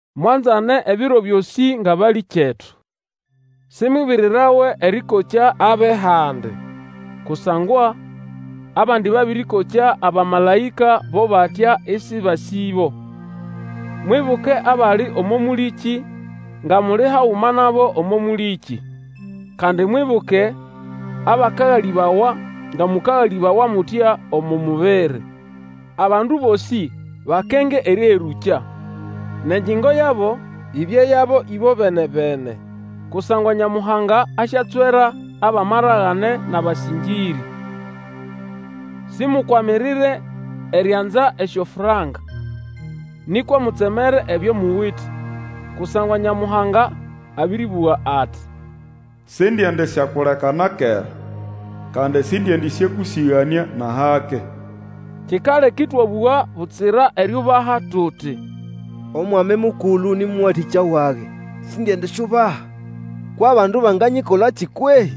Mwanzane ebiro byosĩ ngʼabalĩkyetu. Simwibirirawe erĩkokya abʼehandi, kusangwa abandi babĩrĩkokya abamalaĩka bo batya ĩsĩbasĩbo. Mwibuke abali omo mũlĩkĩ nga muli haguma nabo omo mũlĩkĩ, kandi mwibuke abakagalĩbawa, nga mũkagalĩbawa mutya omo mubiri. Abandu bosĩ bakenge erĩherũkya, nʼengyingo yabo ibye yabo ĩbobene-bene; kusangwa Nyamuhanga asyatswera abʼamaragane nʼabasĩngĩrĩ. Simukwamirire erianza esyofranka, nĩkwa mutsemere ebyo muwite. Kusangwa Nyamuhanga abĩrĩbũga ati, Sindiendisyakuleka na kera, kandi, sindiendĩsyakũsĩganĩa nʼahake. Kikaleka ĩtwabũga butsira eriubaha tuti, Omwami Mukulu nĩ mũwatĩkya wage, sindiendisyubaha! Kwʼabandu banganyikolakĩ kwehĩ?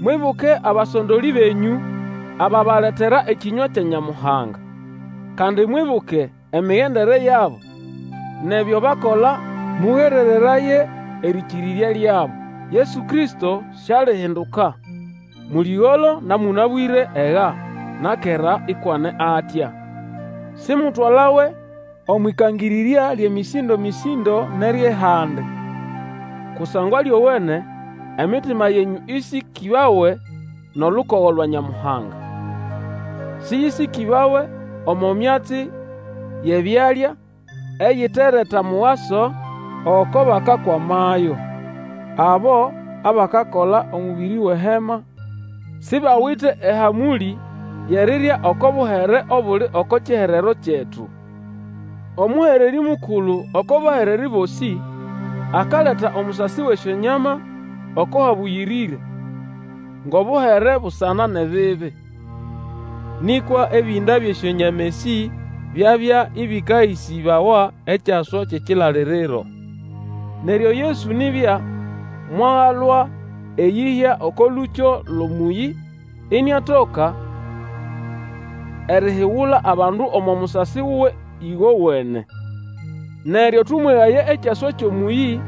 Mwibuke abasondolĩ benyũ, ababaletera ekĩnywa kya Nyamuhanga. Kandi mwibuke emigendere yabo nʼebyo bakola, mũgerereraye erĩkĩrĩrya lyabo. Yesu Kristo sialihinduka; mũlĩgolo na mũnabwĩre, ega na kera, ikwʼane atya. Simutwalawe omwʼĩkangĩrĩrya lyʼemĩsĩndo-mĩsĩndo nʼeryʼehandi. Kusangwa lyowene emitima yenyũ ĩsĩkĩbawe nʼolukogo lwa Nyamuhanga. Sĩyĩsĩkĩbawe omo myatsi yʼebyalya, eyitereta mugaso oko bakakwamayo. Abo abakakola omũbĩrĩ wʼehema sibawite ehamũlĩ yʼerirya oko buhere obuli oko kiherero kyetu. Omũhererĩ Mukulu oko bahererĩ bosĩ akaleta omusasi wʼesyonyama oko Habũyĩrĩre ngʼobuhere busana nʼebibi. Nĩkwa ebĩnda byʼesyonyama esĩ byabya ĩbĩkahĩsĩbawa ekyaswa kyʼekilaliriro. Neryo Yesu nibya mwagalwa eyĩhya oko lũkyo lwʼomũyĩ, iniatoka erihigula abandu omo musasi wuwe ĩgowene. Neryo, tũmwegaye ekyaswa kyʼomũyĩ,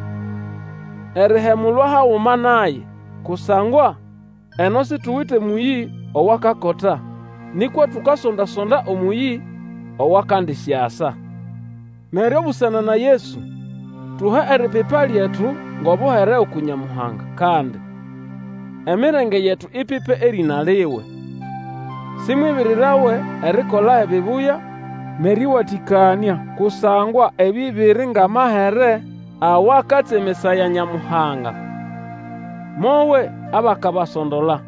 erihemulwa haguma naye. Kusangwa eno situwite mũyĩ owakakota, nĩkwa tukasonda-sonda omũyĩ owakandisyasa. Neryo busana na Yesu, tuhe eripipa lyetu ngʼobuhere uku Nyamuhanga. Kandi emirenge yetu ipipe erĩna liwe. Simwibirirawe erikola ebibuya nʼerĩwatĩkanĩa, kusangwa ebĩ biri ngʼamahere awakatsemesaya Nyamuhanga. Mowe abakabasondola,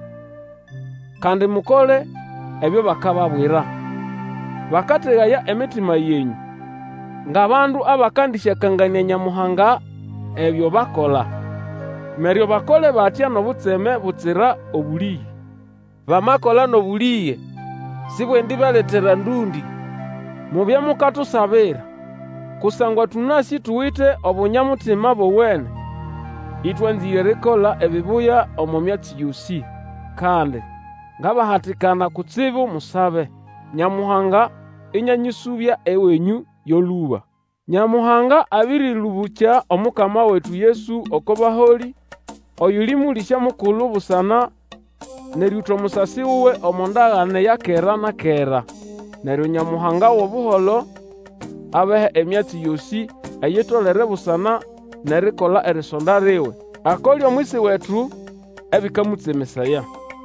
kandi mukole ebyo bakababwira. Bakategaya emitima yenyũ, ngʼabandu abakandĩsyakanganĩa Nyamuhanga ebyo bakola. Neryo bakole batya nʼobutseme butsira obũlĩge. Bamakola nʼobũlĩge sibwendibaletera ndũndĩ. Mubye mukatusabira, kusangwa tũnasĩ tuwite obunya-mutima bowene, ĩtwanzĩre erikola ebibuya omo myatsi yosĩ. Kandi ngabahatikana kutsibu musabe, Nyamuhanga ĩnĩanyĩsũbya ewenyũ yo lũba. Nyamuhanga abĩrĩlũbũkya Omukama wetu Yesu oko baholĩ, oyuli Mũlĩsya mukulu busana nʼerĩũta omusasi wuwe omo ndagane ya kera na kera. Neryo Nyamuhanga wʼobuholo, abahe emyatsi yosĩ eyitolere busana nʼerikola erisonda liwe, akole omwisi wetu ebĩkamũtsemesaya.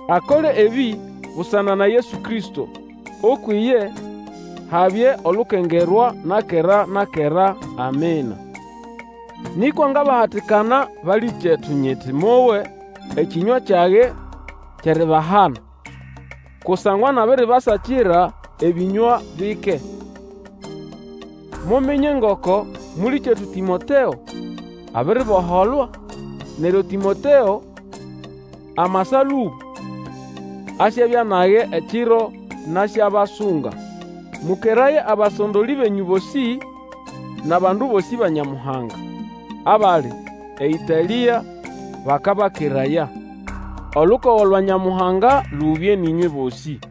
Akole ebĩ busana na Yesu Kristo; ukwʼiye habye olukengerwa na kera na kera. Amina. Nĩkwa ngabahatikana, balĩkyetu, nyiti mowe ekĩnywa kyage kyʼeribahana, kusangwa nabiribasakira ebĩnywa bike. Muminye ngoko mũlĩkyetu Tĩmoteo abiriboholwa; neryo Tĩmoteo amasa lũba, asyabya nage ekiro nasyabasunga. Mũkeraye abasondolĩ benyũ bosĩ, nʼabandu bosĩ ba Nyamuhanga. Abali eĨtalĩa bakabakeraya. Olukogo lwa Nyamuhanga lubye nʼĩnywe bosĩ.